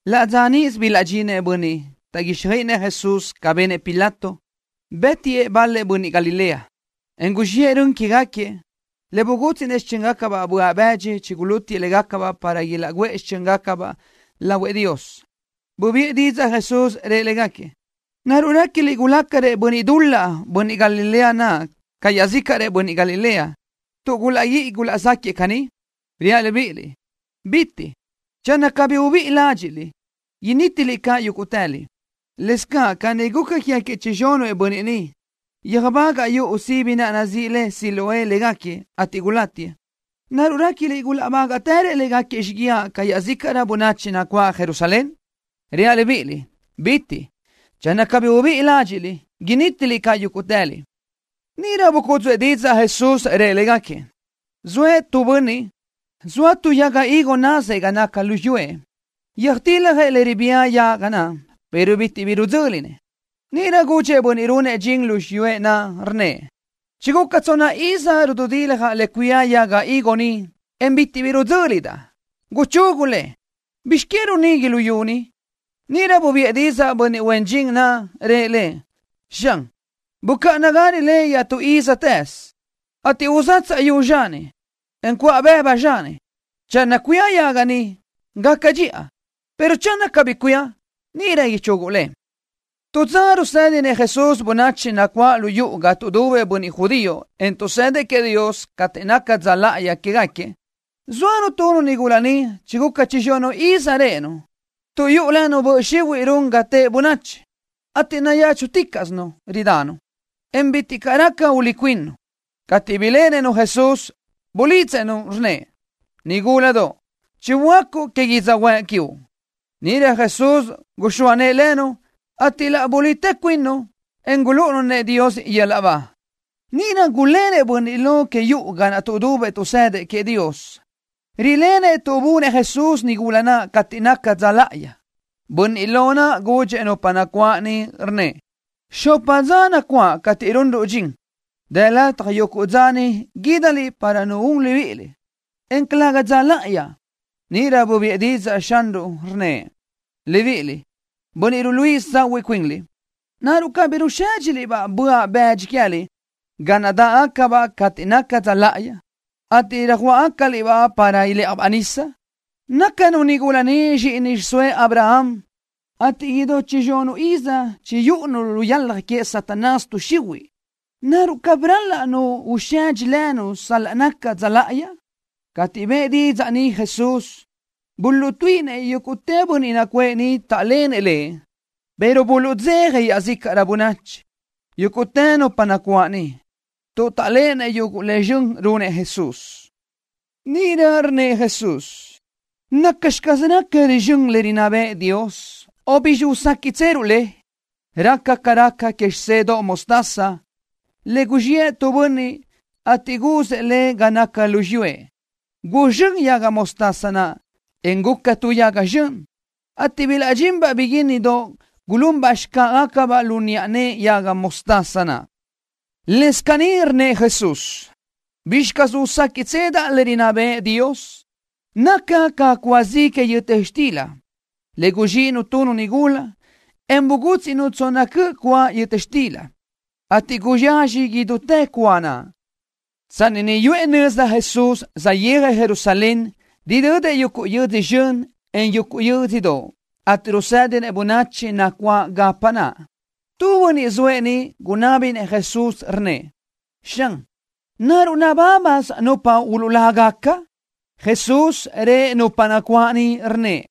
Laʼ dza níʼisö bilaʼdxinëʼ bönniʼ taʼguíxjöiʼinëʼ Jesús ca benëʼ Pilato, bë́tiëʼ bal-lëʼ bönniʼ Galilea, en guzxiʼë rön quégaquiëʼ, le bugútsiʼnëʼ xichö́ngacabaʼ böaʼ bëdxi chigulútiëʼ légacabaʼ para ilaʼguʼë xichö́ngacabaʼ naʼ lahuëʼ Dios. Bubiʼë didzaʼ Jesús, rëʼ légaquiëʼ: —¿Naruʼ réquiliʼ gulácarëʼ bönniʼ dul-laʼ bönniʼ Galilea naʼ ca iaʼzícaʼrëʼ bönniʼ Galilea, tuʼ gulaʼguíʼi gulaʼzaquiëʼ caní? Reaʼ libíʼiliʼ: ¡Calëga! Channö cabí ubíʼi ládxiʼliʼ, nítiliʼ caʼ yúguʼtëliʼ. Lëscaʼ caní guca quégaquiëʼ chizxunëʼ bönniʼ niʼ, yöjbagaʼ yuʼu sibi naʼ nazíʼi le Siloé légaquiëʼ, ateʼ gulátiëʼ. ¿Naruʼ réquiliʼ gulaʼbágaʼtërëʼ légaquiëʼ xíguiaʼ ca iaʼzícaʼrö bönachi nacuáʼ Jerusalén? Reaʼ libíʼiliʼ: ¡Calëga! Channö cabí ubíʼi ládxiʼliʼ, nítiliʼ caʼ yúguʼtëliʼ. Níʼirö bucúdzuʼë didzaʼ Jesús, rëʼ légaquiëʼ: —Zoëʼ tu bönniʼ, zoa tu yaga higo nazëʼ ga naca lu xiyúëʼ. Röjtiljëʼ le ribía yaga naʼ, pero bitiʼ bi ridzö́linëʼ. Níʼirö gudxëʼ bönniʼ runëʼ dxin lu xiyúëʼ naʼ, rnnëʼ: “Chiguca tsonna iz ridaʼ rududiljaʼ le cuía yaga higo ni, en bitiʼ bi ridzö́lidaʼ. Guchugu le. ¿Bizx que run nigui luyú ni?” Níʼirö bubiʼë didzaʼ bönniʼ huen dxin naʼ, rëʼ lëʼ: “Xan, bucáʼanagarö le iaʼtú ízatëz, ateʼ uzatsaʼ yu zxani, en cuʼa bëbu zxani. Channö cuía yaga ni, gaca dxiʼa, pero channö cabí bi cuía, níʼirö ichuguʼ le.” Tu dza rusédinëʼ Jesús bönachi nacuáʼ lu yuʼu ga tuʼdubëʼ bönniʼ judío, en tuʼsëdëʼ queëʼ Dios cateʼ naca dza láʼayi quégaquiëʼ. Zóanu tu nigula niʼ chiguca chizxunuʼ iz réʼenu, tuʼ yuʼu lënu böʼ xihuiʼ run ga teʼe bönachi, ateʼ nayéchuticaʼsinu ridanu, en bitiʼ caʼ raca ulí cuinnu. Cateʼ biléʼenëʼ-nu Jesús, bulidzëʼ-nu, rnnëʼ: —Nigúladoʼ, chiböácuʼ que yödzöhuë́ʼ quiuʼ. Níʼirö Jesús guxóa nëʼë lënu, ateʼ laʼ bulitë cuinnu, en gulúʼunu-nëʼ Dios yöl-laʼ ba. Níʼirö gulénëʼ bönniʼ lo que yuʼu ga naʼ tuʼdubëʼ tuʼsëdëʼ queëʼ Dios. Rilenëʼ tuʼ bunëʼ Jesús nigula naʼ cateʼ naca dza láʼayi. Bönniʼ lo naʼ gudxëʼ nupa nacuáʼ niʼ, rnnëʼ: —Xopa dza nacuáʼ cateʼ runruʼ dxin. Dë lataj yuguʼ dza ni guídaliʼ para nu un libíʼiliʼ, en calëga dza láʼayi. Níʼirö bubiʼë didzaʼ Xanruʼ, rnnëʼ: —Libiʼiliʼ, bönniʼ ruluíʼisö tsahuiʼ cuinliʼ, ¿naruʼ cabí rusédxigacaliʼ-baʼ böaʼ bëdxi que queë́liʼ ga naʼ dáʼgacabaʼ cateʼ naca dza láʼayi, ateʼ tsöjuáʼagacaliʼ-baʼ para ilë́ʼajbaʼ nisa? Nácanu nigula ni zxíʼini xiʼsóëʼ Abraham, ateʼ idú chizxunuʼ iz chiyúʼunu lu yalaj que Satanás tuʼ xihuiʼ. ¿Naruʼ cabí ral-laʼ nu usedxi lënu sal-laʼ naca dza láʼayi? Cateʼ bëʼë didzaʼ ni Jesús, buluʼtuíʼinëʼ yúguʼtë bönniʼ nacuʼë niʼ taʼlenëʼ Lëʼ, pero buluʼdzeja iaʼzícaʼrö bönachi, yúguʼtë nupa nacuáʼ niʼ, tuʼ taʼléʼenëʼ yuguʼ le zxön runëʼ Jesús. Níʼirö rnnëʼ Jesús: —¿Nacxi caz raca rizxö́n le rinná bëʼë Dios, o bizxi uséquiʼtseruʼ le? Raca ca raca que xisedoʼ mostaza, le guzxiʼë tu bönniʼ, ateʼ guzëʼ le ga naca lu xiyúëʼ. Guzxö́n yaga mostaza naʼ, en guca ca tu yaga zxön, ateʼ bilaʼdxinbaʼ biguínnidoʼ, gulunbaʼ xcáʼagacabaʼ lu niʼa nëʼe yaga mostaza naʼ. Lëscaʼ caní rnnëʼ Jesús: —¿Bizxi caz uséquiʼtsedaʼ le rinná bëʼë Dios? Naca ca cúa zi que yöta xtila, le guzxíʼinu tu nigula, en bugútsiʼnu tsonna cöʼ cúa yöta xtila, ateʼ guyazxaj idútë cúa naʼ. Tsanni niʼ yuʼë nöza Jesús, saʼyéajëʼ Jerusalén, ridödëʼ yuguʼ yödzö zxön, en yuguʼ yö́dzödoʼ, ateʼ rusédinëʼ bönachi nacuáʼ gapa naʼ. Tu bönniʼ zoëʼ niʼ gunábinëʼ Jesús, rnnëʼ: —Xan, ¿naruʼ nabábasö nupa uluʼlágaca? Jesús rëʼ nupa nacuáʼ niʼ, rnnëʼ: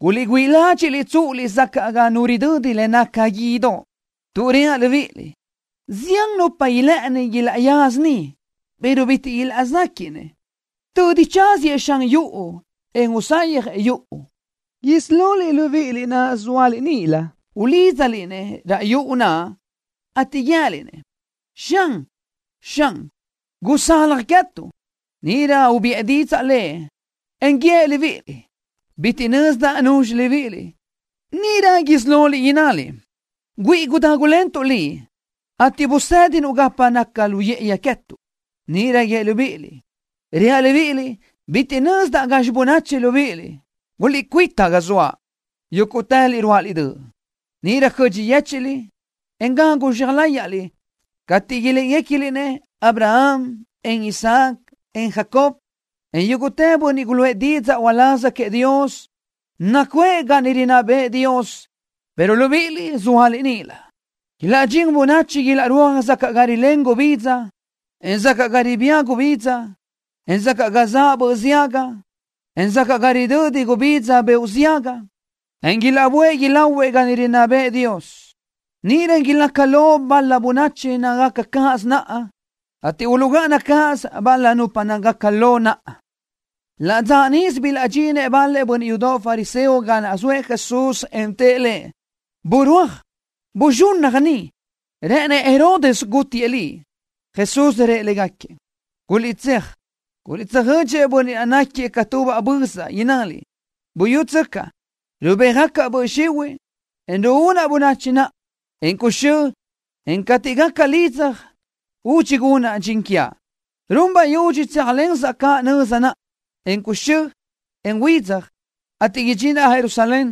—Guliʼgüíʼi ládxiʼliʼ tsúʼuliʼ sacaʼ ga nu ridödi le naca guídoʼ, tuʼ reaʼ libíʼiliʼ: Zián nupa ilë́ʼëni ilaʼyaza niʼ, pero bitiʼ ilaʼzéquiʼnëʼ. Tödi chasëʼ Xan yuʼu, en usayjëʼ yuʼu, isí loliʼ libíʼiliʼ naʼ zóaliʼ níʼilö ulídzaliʼ-nëʼ raʼ yuʼu naʼ, ateʼ guië́liʼ-nëʼ: “Xan, Xan, gusalaj queë́tuʼ.” Níʼirö ubiʼë didzaʼ Lëʼ, en guíëʼ libíʼiliʼ: “Bitiʼ nözdaʼ nuzxi libíʼiliʼ.” Níʼirö isí loliʼ innaliʼ: “Güíʼi gudágulentuʼ Liʼ, ateʼ busédinuʼ gapa naca lu yë́ʼëyi queë́tuʼ.” Níʼirö guíëʼ libíʼiliʼ: “Reaʼ libíʼiliʼ, bitiʼ nözdaʼ gazxi bönachi libíʼiliʼ. Guliʼcuíta ga zoaʼ, yúguʼtëliʼ ruáʼaliʼ döʼ.” Níʼirö cödxi yéchiʼliʼ, en gagu zxea láyaʼliʼ cateʼ iléʼegacaliʼ-nëʼ Abraham, en Isaac, en Jacob, en yúguʼtë bönniʼ guluʼë didzaʼ uláz queëʼ Dios, nacuʼë ga niʼ rinná bëʼë Dios, pero libíʼiliʼ sóaliʼ níʼilö. Ilaʼdxín bönachi ilaʼrúaj sacaʼ ga rilén gubidza, en sacaʼ ga ribía gubidza, en sacaʼ ga zaʼ böʼ ziaga, en sacaʼ ga ridödi gubidza beoʼ ziaga, ateʼ ilaʼböʼë ilahuëʼ ga niʼ rinná bëʼë Dios. Níʼirö ilaca lo bal-la bönachi nácagaca cáʼasö naʼa, ateʼ uluʼgáʼana cáʼasö bal-la nupa nácagaca lo naʼa. Laʼ dza níʼisö bilaʼdxinëʼ bal-la bönniʼ yudoʼ fariseo ga zoëʼ Jesús en tëʼ Lëʼ: —¡Burúaj! ¡Buzxunnaj ni! ¡Rë́ʼënëʼ Herodes gútiëʼ Liʼ! Jesús rëʼ légaquiëʼ: —Guliʼtséaj, guliʼtsöjödxëʼ bönniʼ naʼ náquiëʼ ca tubaʼ bözaʼ, innaliʼ: “Buyútsöcaʼ, rubéajgacaʼ böʼ xihuiʼ, en ruúnaʼ bönachi naʼa, en cuxö́, en cateʼ gaca lidzaj, údxi gunaʼ dxin quiaʼ.” Run bayudxi tséajlensaʼ caʼ nöza naʼa, en cuxö́, en huidzaj, ateʼ idxinaʼ Jerusalén,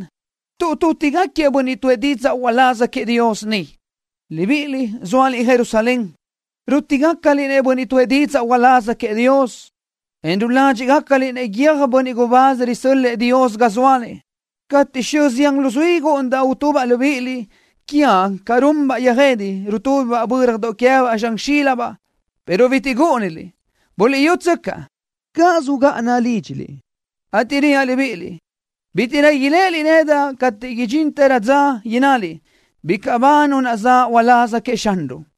tuʼ tútigaquiëʼ bönniʼ tuʼë didzaʼ uláz queëʼ Dios niʼ. ’Libíʼiliʼ, zóaliʼ Jerusalén. Rútigacaliʼ-nëʼ bönniʼ tuʼë didzaʼ uláz queëʼ Dios, en ruládxiʼgacaliʼ-nëʼ guiö́j bönniʼ gubáz risö́l-lëʼë Dios ga zóaliʼ. Cateʼ xö zián luzuí gúʼunidaʼ utubaʼ libíʼiliʼ quiaʼ ca runbaʼ yöjede, rutúbibaʼ bö́radoʼ queë́baʼ zxan xílibaʼ, pero bitiʼ gúʼuniliʼ. Buliʼyútsöcaʼ, cáʼasö ugáʼana lídxiliʼ, ateʼ reaʼ libíʼiliʼ, bítiʼrö iléʼeliʼ nedaʼ cateʼ idxinrö dza innaliʼ: “Bicaʼ ba Nu naʼ zaʼ uláz queëʼ Xanruʼ.”